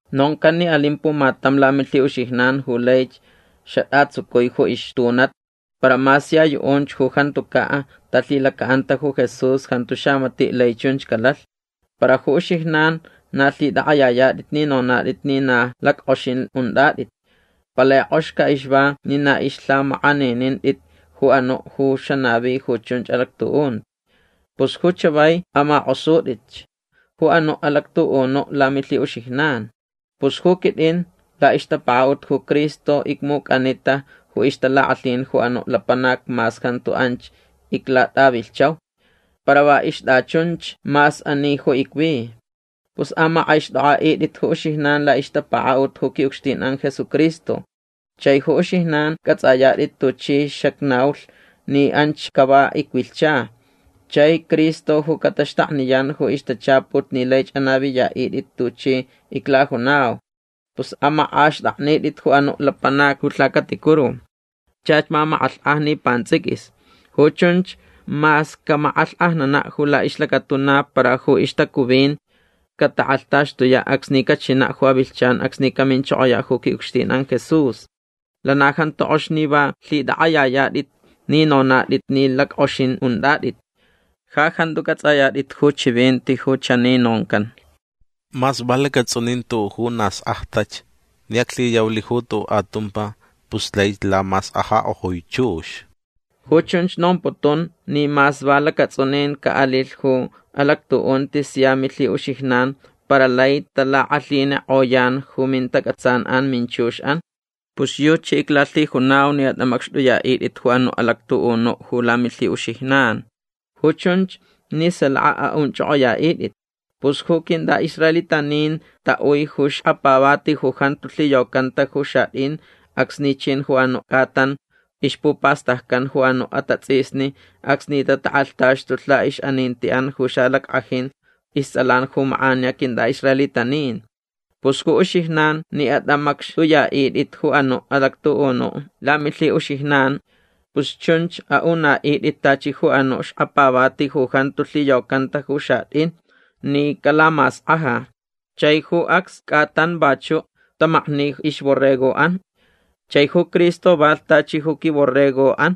Noncan ni alin pumatam lamilhiʼuxijnan ju laich xatʼatsucui ju ixtunati. Para mas sia yuʼunch ju jantucaʼ talhilacaʼanta ju Jesús jantu xamatiʼ lai chunch calalh. Para ju uxijnan na lhitʼakʼayayatʼit ni nonatʼit ni na lackʼoxin untʼatʼit. Palai kʼox caʼixva ni na ixlhamakʼaninintʼit ju anuʼ ju xanavi ju chunch alactuʼunti. Pus ju chavai amakʼosutʼitch ju anuʼ alactuʼunuʼ lamilhiʼuxijnan. Pus ju quitʼin laʼixtapakaʼut ju Cristo icmucʼanita ju ixtalakʼalhin ju anuʼ lapanac mas jantu anch iclatʼavilhchau. Para va ixtʼachunch mas ani ju icvi. Pus amakʼaixtʼokʼaʼitʼit ju uxijnan laʼixtapakaʼut ju quiʼucxtinʼan Jesucristo. Chai ju uxijnan cʼatsʼayatʼit tuchi xacnaulh ni anch cava icvilhcha. Chai Cristo ju cataxtakniyan ju ixtachaput ni laich anaviyaʼitʼit tuchi iclajunau. Pus amakʼaxtʼaknitʼit ju anuʼ lapanac ju lhacaticuru. Chach mamakʼalhkʼajni pantsʼiquis. Ju chunch mas camakʼalhkʼajnanaʼ ju laʼixlacatuna para ju ixtacuvin catakʼalhtaxtuyaʼ acsni cachinaʼ ju avilhchan acsni caminchokoyaʼ ju quiʼucxtinʼan Jesús. Lana jantu kʼox ni va lhitʼakʼayayatʼit ni nonatʼit ni lackʼoxin untʼatʼit. Ja jantu cʼatsʼayatʼit ju chivinti ju chani noncan: “Mas va lacatsʼunin tuʼuʼ ju na skʼajtach ni aclhiyaulh ju tuʼuʼ atumpa pus laich lamaskʼajkʼojui chux”. Ju chunch nomputun ni mas va lacatsʼunin caʼalilh ju alactuʼunti sia milhiʼuxijnan para lai talakʼalhinikʼoyan ju mintacʼatsanʼan minchuxʼan. Pus yuchi iclalhijunau ni atʼamacxtʼuyaʼitʼit ju anuʼ alactuʼunuʼ ju lamilhiʼuxijnan. Ju chunch ni salaka aʼunchʼokʼoyaʼitʼit. Pus ju quintʼaʼisraelitanin taʼui ju xkapavati ju jantu lhiyocanta ju xatʼin acsni chin ju anuʼ cʼatan ixpupastaccan ju anuʼ atatsʼisni acsni tatakʼalhtaxtulh laʼixʼanintiʼan ju xalackʼajin istsʼalan ju makʼaniya quintʼaʼisraelitanin. Pus ju uxijnan ni atʼamacxtʼuyaʼitʼit ju anuʼ alactuʼunuʼ lamilhiʼuxijnan pus chunch aʼunaʼitʼit tachi ju anuʼ xkapavati ju jantu lhiyocanta ju xatʼin ni calamaskʼaja. Chai ju acs cʼatan vachuʼ tamakni ixborregoʼan. Chai ju Cristo valh tachi ju quimborregoʼan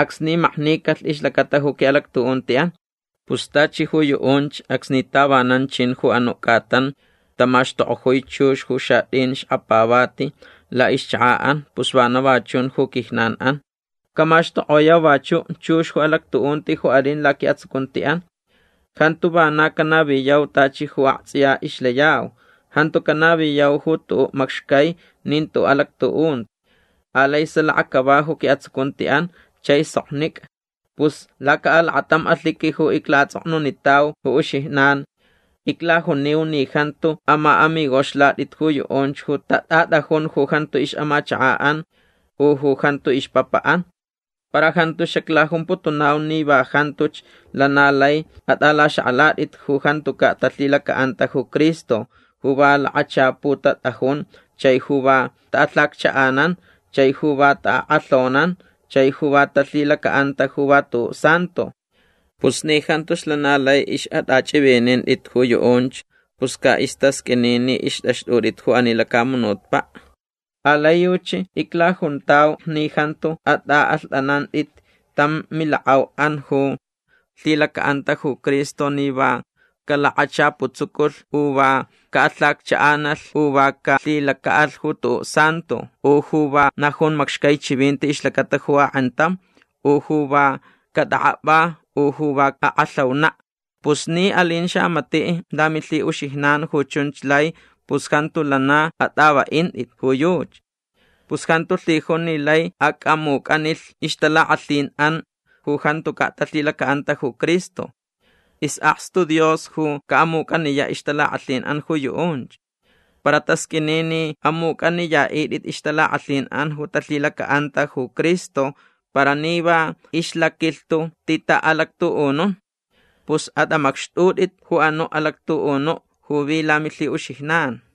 acsni maknicalh ixlacata ju quiʼalactuʼuntiʼan. Pus tachi ju yuʼunch acsni tavanan chin ju anuʼ cʼatan tamaxtukʼojui chux ju xatʼin xkapavati laʼixchakaʼan pus vana va chun ju quijnanʼan. Camaxtukʼoyau vachuʼ chux ju alactuʼunti ju alin laquiʼatsucuntiʼan. Jantu vana canaviyau tachi ju aktsʼiya ixlayau. Jantu canaviyau ju tuʼuʼ macxcai nin tuʼuʼ alactuʼunti. Alai salaka cava ju quiʼatsucuntiʼan chai soknicʼa. Pus lacaʼalakatam alhiqui ju iclaʼatsʼoknunitau ju uxijnan iclajuniu ni jantu amaʼamigoxlatʼit ju yuʼunch ju tatʼatʼajun ju jantu ixʼamachakaʼan u ju jantu ixpapaʼan. Para jantu xaclajumputunau ni va jantuch lana lai atʼalaxakʼalatʼit ju jantucaʼ talhilacaʼanta ju Cristo ju va lakachapu tatʼajun chai ju va taʼalhacchaʼanan chai ju va taʼakʼalhonan chai ju va talhilacaʼanta ju va tuʼuʼ santo. Pus ni jantuch lana lai ixʼatʼachʼivinintʼit ju yuʼunch pus ca istasqʼuini ni ixtʼaxtʼutʼit ju ani lacamunutpaʼ. Alai yuchi iclajuntau ni jantu atʼaʼalhtʼanantʼit tam milakʼauʼan ju lhilacaʼanta ju Cristo ni va calakachaputsuculh u va caʼalhacchaʼanalh u va calhilacaʼalh ju tuʼuʼ santo u ju va najun macxcai chivinti ixlacata ju akʼantam u ju va catʼakʼapʼa u ju va akʼalhaunaʼ. Pus ni alin xamatiʼ lamilhiʼuxijnan ju chunch lai pus jantu lana atʼavaʼintʼit ju yuchi. Pus jantu lhijun ni lai acʼamucʼanilh ixtalakʼalhinʼan ju jantucaʼ talhilacaʼanta ju Cristo. Isʼakstu Dios ju caʼamucʼaniyaʼ ixtalakʼalhinʼan ju yuʼunch. Para tasqʼuini ni amucʼaniyaʼitʼit ixtalakʼalhinʼan ju talhilacaʼanta ju Cristo para ni va ixlaquilhtu titaʼalactuʼunun. Pus atʼamacxtʼutʼit ju anuʼ alactuʼunuʼ ju vi lamilhiʼuxijnan.